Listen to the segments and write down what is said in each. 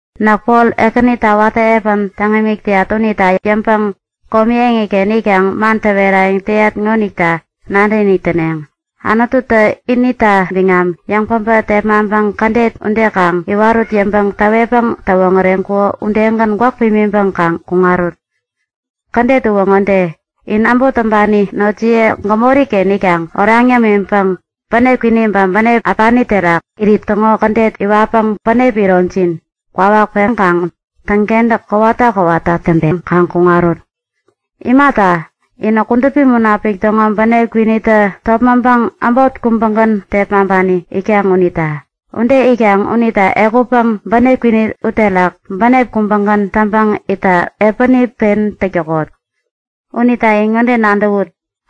Näk Pol, Ekänita watä piä täŋ imik täyat unita yäŋpäŋ komi eŋiken itkaŋ man täwerayäŋ täyat ŋonita nadäkinik täneŋ; Anututä inita biŋam yäŋpäbä tepmaŋpäŋ kädet ude kaŋ iwarut yäŋpäŋ täwetpäŋ täwoŋäreŋkuko udegän gwäk pimiŋpäŋ kaŋ kuŋarut. Kädet uwä ŋode; In äbot täŋpani notjiye gämori-ken itkaŋ oraŋ yämiŋpäŋ bänep kwini ba bänep äpani terak irit täŋo kädet iwatpäŋ bänep ironjin kwawak peŋkaŋ täŋkentäk kowata kowata täŋpeŋ kaŋ kuŋarut. Imata, inä Kudupi Munapik täŋo bänep kwinitä topmäŋpäŋ äbot kubägän tepmaŋpani itkaŋ unita. Ude itkaŋ unita ehutpäŋ bänep kwini uterak bänep kubägän täŋpäŋ itta piäni pen täk täkot. Unita in ŋode nadäwut;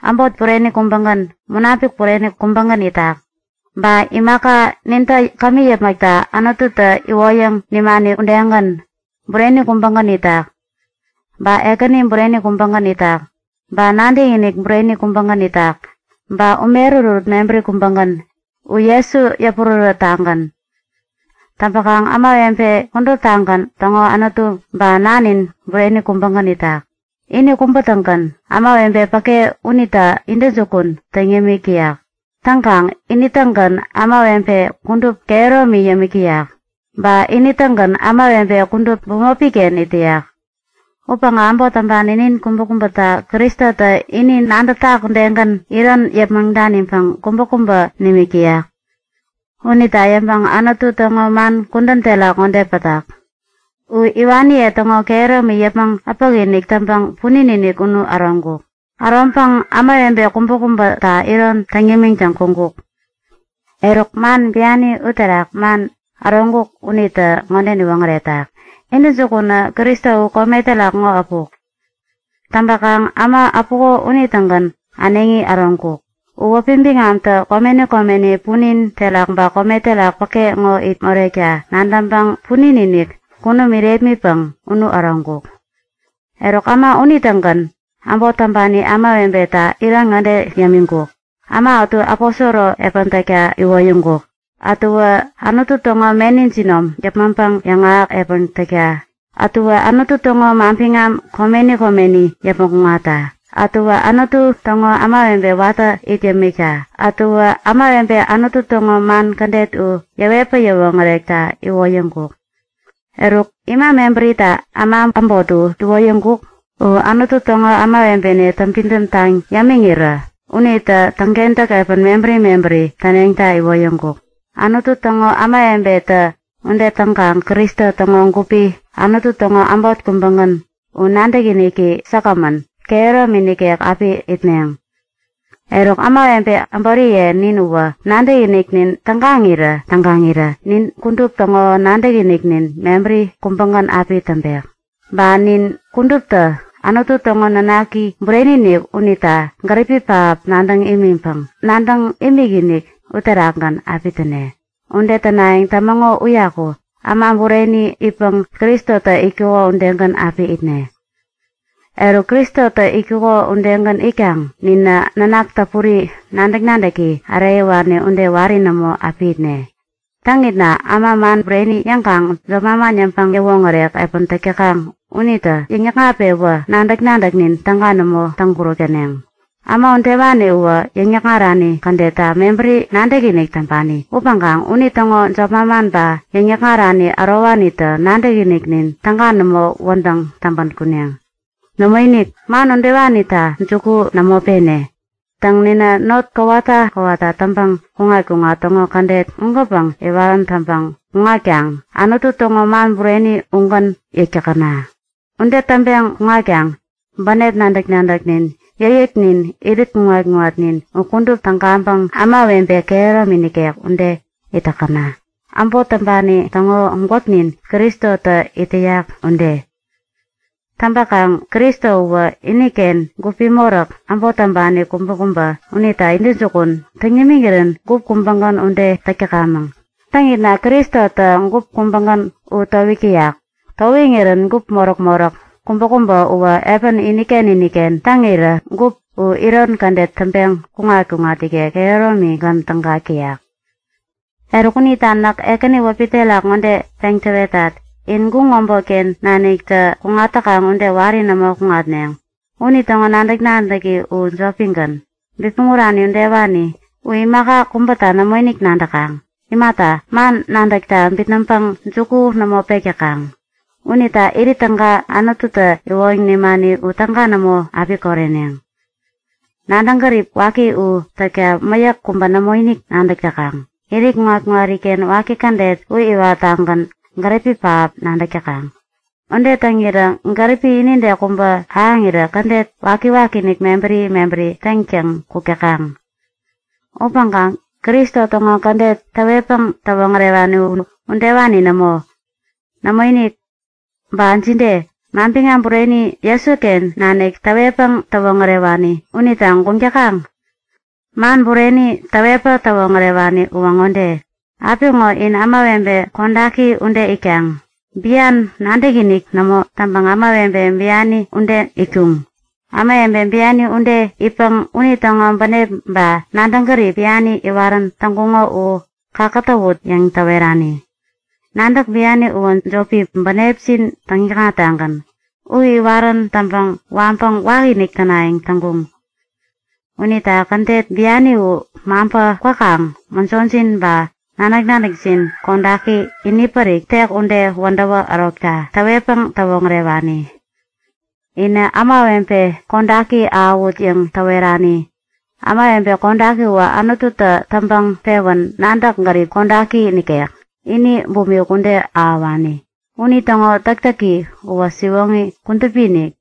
Äbot bureni kubägän, Munapik bureni kubägän itak. Ba imaka nintä kämi yäpmäkta Anututä iwoyäŋ nimani u udegän, bureni kubägän itak. Ba Ekäni bureni kubägän itak, ba nadäkinik bureni kubägän itak, ba ume ärutärut mebäri kubägän, u Jesu yäpurärät-tagän. Täŋpäkaŋ ämawebe kuduptagän täŋo Anutu ba Nanin bureni kubägän itak. Ini kubä-tägän ämawebe päke unita intäjukun täŋ yämik täyak. Täŋkaŋ ini-tägän ämawebe kudup kehäromi yämik täyak. Ba ini-tägän ämawebe kudup bämopi-ken it täyak. Upäŋkaŋ äbot täŋpani nin kubäkubäta Kristotä ini nadätak udegän iron yäpmäŋ daniŋpäŋ kubäkubä nimik täyak. Unita yäŋpäŋ Anutu täŋo man kudän terak ŋode pätak; U iwaniye täŋo kehäromi yäpmäŋ äpäkinik täŋpäŋ punin-inik unu äroŋkuk. Äroŋpäŋ ämawebe kubäkubäta iron yämiŋtäŋ kuŋkuk. Eruk, man biani uterak man “äroŋkuk” unitä ŋode niwoŋäretak; Intäjukunä Kristo u kome terak ŋo äpuk. Täŋpäkaŋ äma äpuko unitägän äneŋi äroŋkuk. U wäpi biŋamtä komeni komeni, punin terak ba kome terak päke ŋo it morekta nadäŋpäŋ punin-inik, kunum irepmitpäŋ unu äroŋkuk. Eruk, äma unitägän äbot täŋpani ämawebeta iron ŋode yämiŋkuk; Äma ätu aposoro piä täkta iwoyäŋkuk. Ätuwä Anutu täŋo meni jinom yäpmäŋpäŋ yäŋahäk piä täkta. Ätuwä Anutu täŋo manbiŋam komeni komeni yäpmäŋ kuŋatta. Ätuwä Anutu täŋo kudupi ämawebe watä it yämikta. Ätuwä ämawebe Anutu täŋo man kädet u yäwetpäŋ yäwoŋärekta iwoyäŋkuk. Eruk, ima mebärita äma äbot u iwoyäŋkuk? U Anutu täŋo kudupi ämawebeniye täŋpidäm taŋ yämiŋirä unitä täŋkentäk piä mebäri mebäri täneŋta iwoyäŋkuk. Anutu täŋo kudupi ämawebetä ude täŋkaŋ Kristo täŋo gupi, Anutu täŋo äbot kubägän u nadäkiniki säkgämän, kehäromi nikek api itneŋ. Eruk ämawebe äboriye nin uwä nadäkiniknin tägaŋirä-tägaŋirä nin kudup täŋo nadäkiniknin mebäri kubägän api täŋpek! Ba nin kuduptä Anutu täŋo Nanaki Bureni-inik unita gäripi pähap nadäŋ imiŋpäŋ nadäŋ imikinik uterakgän api täne. Ude tänayäŋ tämäŋo uyaku äma bureni itpäŋ Kristotä itkuko udegän api itne. Eruk, Kristotä itkuko udegän itkaŋ ninä nanak täpuri, nadäk-nadäki äreyäwani ude wari nämo api itne. Täŋitna äma man bureni yäŋkaŋ jop manman yäŋpäŋ-yäwoŋärek piä täk täkaŋ unitä yäŋ-nikŋat-pewä nadäk-nadäknin täga nämo täŋkuräk täneŋ. Äma udewani uwä yäŋ-yäkŋarani kädetta mebäri nadäkinik täŋpani upäŋkaŋ unitäŋo jop manman ba yäŋ-yäkŋarani ärowanitä nadäkiniknin täga nämo wädäŋ täŋpän kuneŋ. Nämoinik, man udewanita juku nämo pene. Täŋ, ninä not kowata kowata täŋpäŋ kuŋat-kuŋat täŋo kädet ugänpäŋ iwarän täŋpäŋ kuŋatkaŋ Anutu täŋo man bureni ugän yäk täkäna. Ude täŋpeŋ kuŋatkaŋ bänep nadäk-nadäknin, yäkyäknin, irit kuŋat-kuŋatnin u kudup tägaŋpäŋ ämawebe kehäromi nikek ude it täkäna, äbot täŋpani täŋo gwäknin Kristotä it täyak ude. Täŋpäkaŋ Kristo uwä iniken gupi moräk, äbot täŋpani kubäkubä unita intäjukun täŋ nimiŋirän gup kubägän ude täk täkamäŋ. Täŋitna Kristotä gup kubägän u towik täyak. Towiŋirän gup moräk-moräk kubäkubä uwä piä iniken iniken täŋirä gup u iron kädet täŋpeŋ kuŋat-kuŋat ikek kehäromigän tägak täyak. Eruk unita näk Ekäni wäpi terak ŋode peŋ täwetat; In guŋ äbotken naniktä kuŋat täkaŋ ude wari nämo kuŋatneŋ. Unitäŋo nadäk-nadäki u jopigän, bipmäŋ urani udewani. U imaka kubäta nämoinik nadäkaŋ. Imata, man nadäkta bitnäŋpäŋ juku nämo pek täkaŋ. Unita irit täga Anututä iwoyäŋ nimani u täga nämo api koreneŋ. Nadäŋ-gärip waki u täkta mäyäk kubä nämoinik nadäk täkaŋ. Irit kuŋat-kuŋariken waki kädet u iwattagän gäripi pähap nadäk täkaŋ. Ude täŋirä gäripi inide kubä ahäŋirän kädet waki-wakiinik mebäri mebäri täŋtäŋ kuk täkaŋ. Upäŋkaŋ Kristo täŋo kädet täwetpäŋ täwoŋärewani u udewani nämo. Nämoinik! Ba jide? Manbiŋam bureni Jesuken nanik täwetpäŋ täwoŋärewani unita guŋ täkaŋ? Man bureni täwetpäŋ täwoŋärewani uwä ŋode; Apiŋo in ämawebe kodaki ude itkaŋ. Bian nadäkinik nämo täŋpäŋ ämawebe biani ude itkuŋ. Ämawebe biani ude itpäŋ unitäŋo bänep ba nadäŋ gärip biani iwarän täŋkuŋo u kakätäwut yäŋ täwerani. Nadäk biani uwä jopi, bänepjin täŋ-täkŋattagän. U iwarän täŋpäŋ waŋpäŋ wakinik tänayäŋ täŋkuŋ. Unita kädet biani u maŋpä kwäkaŋ mäjojin ba nadäk-nadäkjin kodaki inipärik, tek ude wädäwä ärokta täwetpäŋ täwoŋärewani. Inä ämawebe kodaki ahäwut yäŋ täwerani. Ämawebe kodaki uwä Anututä täŋpäŋ pewän nadäk-gärip kodaki nikek, ini bumik ude ahäwani. Unitäŋo täktäki uwä siwoŋi kudupi-inik.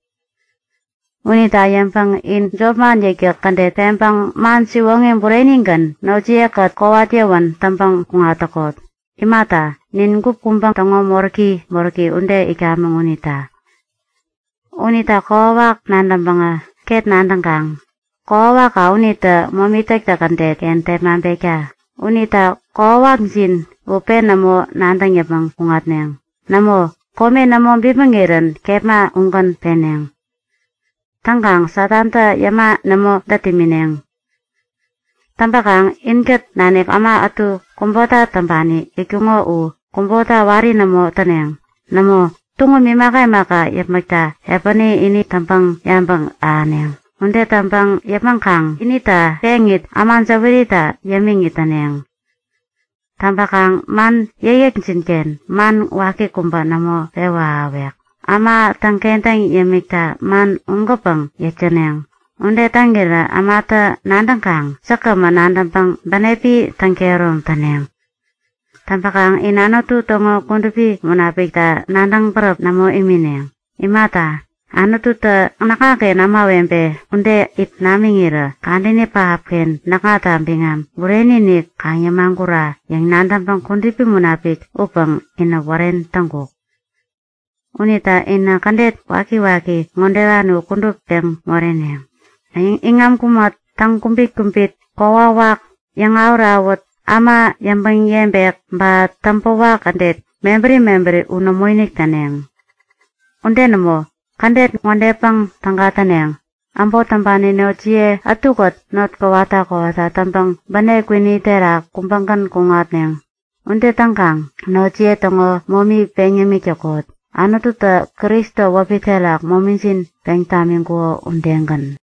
Unita yäŋpäŋ in jopman yäkyäk kädet peŋpäŋ man siwoŋi burenigän notjiye-kät kowat yäwän täŋpäŋ kuŋat täkot. Imata, nin gup kubä täŋo moräki moräki ude itkamäŋ unita. Unita kokwawak nadäŋpäŋä, ket nadäŋkaŋ; Kokwawakka unitä momi täktäk kädet-ken tepmaŋpekta. Unita kokwawakjin u pen nämo nadäŋ yäpmäŋ kuŋatneŋ. Nämo, kome nämo bipmäŋirän kepma ugän peneŋ. Täŋkaŋ Satanta yäma nämo dät imineŋ. Täŋpäkaŋ inkät nanik äma ätu kubota täŋpani itkuŋo u kubota wari nämo täneŋ. Nämo, tuŋum imaka imaka yäpmäkta piäni ini täŋpäŋ yabäŋ ahäneŋ. Ude täŋpäŋ yäpmäŋkaŋ inita peŋit, äma jäwärita yämiŋit täneŋ. Täŋpäkaŋ man yäkyäkjin-ken man waki kubä nämo pewä ahäwek. Äma täŋkentäŋ yämikta man ugänpäŋ yäk täneŋ. Ude täŋirä ämatä nadäŋkaŋ säkgämän nadäŋpäŋ bänepi täŋkehärom täneŋ. Täŋpäkaŋ in Anutu täŋo Kudupi Munapikta nadäŋ bäräp nämo imineŋ. Imata, Anututä näkŋaken ämawebe ude it namiŋirä kadäni pähapken näkŋata biŋam bureni-inik kaŋ yämagura yäŋ nadäŋpäŋ Kudupi Munapik upäŋ inä wären täŋkuk. Unita inä kädet wakiwaki ŋodewani u kudup peŋ moreneŋ; Iŋam kumät, täŋkubit-kubit, kokwawak, yäŋawät-awät, äma yäŋpäŋ-yebek, ba täŋpäwak kädet mebäri mebäri u nämoinik täneŋ. Nämo, kädet ŋodepäŋ täga täneŋ; Äbot täŋpani notjiye ätukät not kowata kowata täŋpäŋ bänep kwini terak kubägän kuŋatneŋ. Ude täŋkaŋ notjiye täŋo momi peŋ yämik täkot, Anututä Kristo wäpi terak momijin peŋ tamiŋkuko udegän.